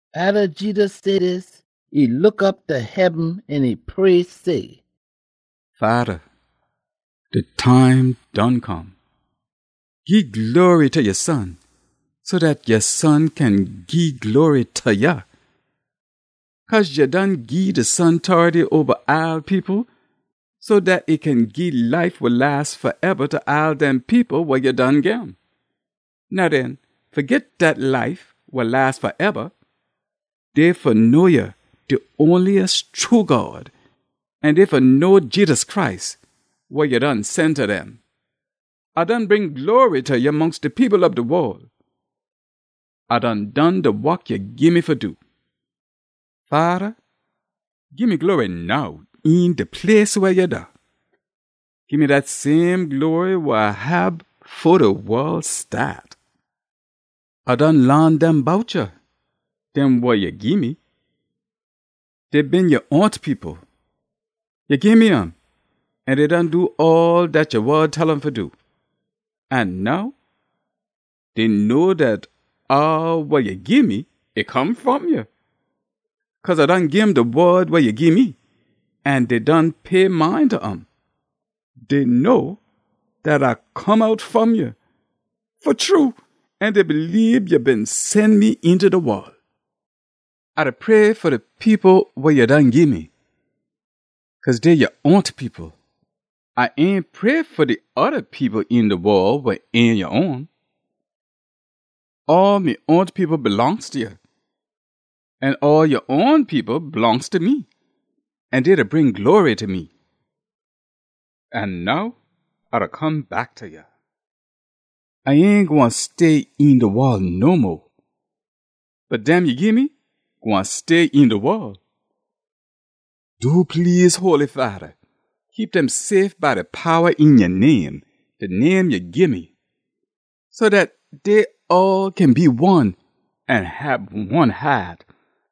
Atta Jedus say dis, e look op ta heaben an e pray say, “Fada, de time done come. Gii glory ta ya Son, so dat ya Son kin gii glory ta ya. Cause ya done gii de Son tority oba all people, so dat e kin gii life wa las faeba ta all dem people wa ya done gim. Now den, fa git dat life wa las faeba dey fa know ya, de onliest true God, an dey fa know Jedus Christ, wa ya done sen ta dem. A done bring glory ta ya mongst de people ob de wol. A done done de wok ya gii me fa do. Fada, gii me glory now een de place weh ya da. Gii me dat same glory wa A hab fo de wol staat. “A done laan dem bout ya, dem wa ya gii me. Dey been ya own people. Ya gii me um, an dey done do all dat ya wod tell um fa do. An now dey know dat all wa ya gii me, e come fom ya. Cause A done gim de wod wa ya gii me, an dey done pay mind ta um. Dey know dat A come out fom ya fa true, an dey bleebe ya been sen me eenta de wol. “A da pray fa de people wa ya done gii me, cause dey ya own people. A ain pray fa de oda people een de wol wa ain ya own. All me own people blongst ta ya, an all ya own people blongst ta me, an dey da bring glory ta me. An now A da come back ta ya. A ain gwine stay een de wol no mo, bot dem ya gii me gwine stay een de wol. Do please, Holy Fada, keep dem safe by de powa een ya name, de name ya gii me, so dat dey all kin be one, an hab one haat,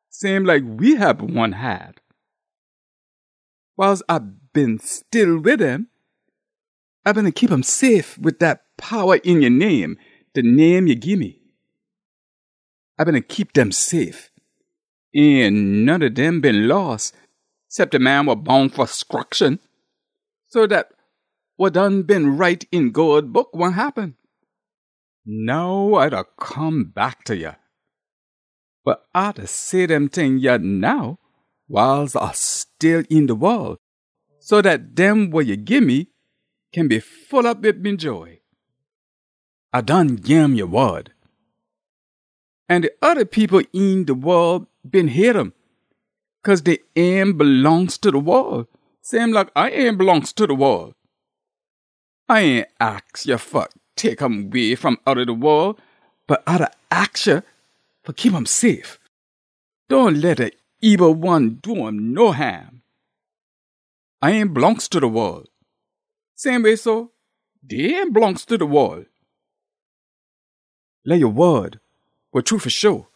same like we hab one haat. Wiles A been still wid dem, A beena keep um safe wid dat powa een ya name, de name ya gii me. A beena keep dem safe. Ain none ob dem been loss, cep de man wa boun fa scruction, so dat wa done been write een God Book gwine happen. Now A da come back ta ya. Bot A da say dem ting yah now wiles A still een de wol, so dat dem wa ya gii me kin be full op wid me joy. A done gim ya wod. An de oda people een de wol been hate um, cause dey ain blongst ta de wol, same like A ain blongst ta de wol. A ain aks ya fa tek um way fom outta de wol, bot A da aks ya fa keep um safe. Dohn leh de ebil one do um no haam. A ain blongst ta de wol. Same way so, dey ain blongst ta de wol. Leh ya wod, wa true fa sho,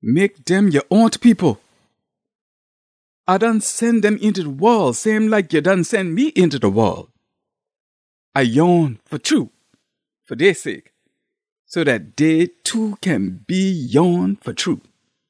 mek dem ya own people. A done sen dem eenta de wol, same like ya done sen me eenta de wol. A ya own fa true, fa dey sake, so dat dey too kin be ya own fa true.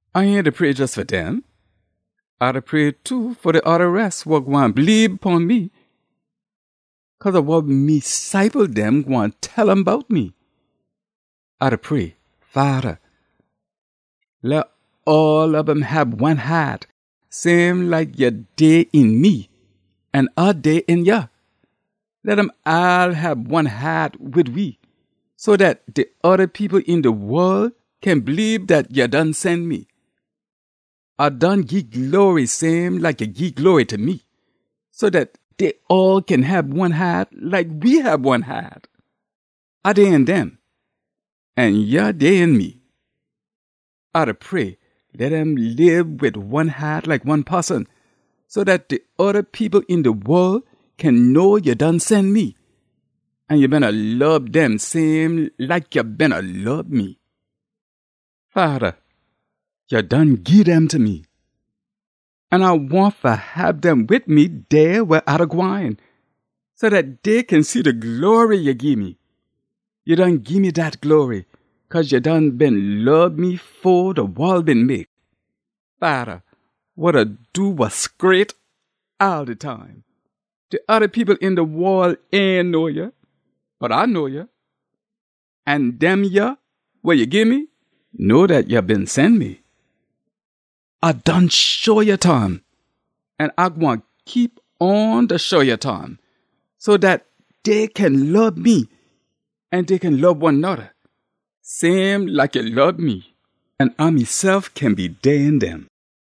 “A ain da pray jes fa dem. A da pray too fa de oda res wa gwine bleebe pon me cause ob wa me ciple dem gwine tell um bout me. A da pray, Fada, leh all ob um hab one haat, same like ya dey een me an A dey een ya. Leh dem all hab one haat wid we, so dat de oda people een de wol kin bleebe dat ya done sen me. A done gii glory same like ya gii glory ta me, so dat dey all kin hab one haat like we hab one haat. A dey een dem an ya dey een me. A da pray, leh dem lib wid one haat like one poson, so dat de oda people een de wol kin know ya done sen me, an ya beena lob dem same like ya beena lob me. “Fada, ya done gii dem ta me, an A wahn fa hab dem wid me dey weh A da gwine, so dat dey kin see de glory ya gii me. Ya done gii me dat glory, cause ya done been lob me fo de wol been mek. Fada, wa da do wa scraight all de time, de oda people een de wol ain know ya. Bot A know ya, an dem yah wa ya gii me know dat ya been sen me. A done show ya ta um. An A gwine keep on da show ya ta um, so dat dey kin lob me an dey kin lob one noda same like ya lob me, an A mesef kin be dey een dem.”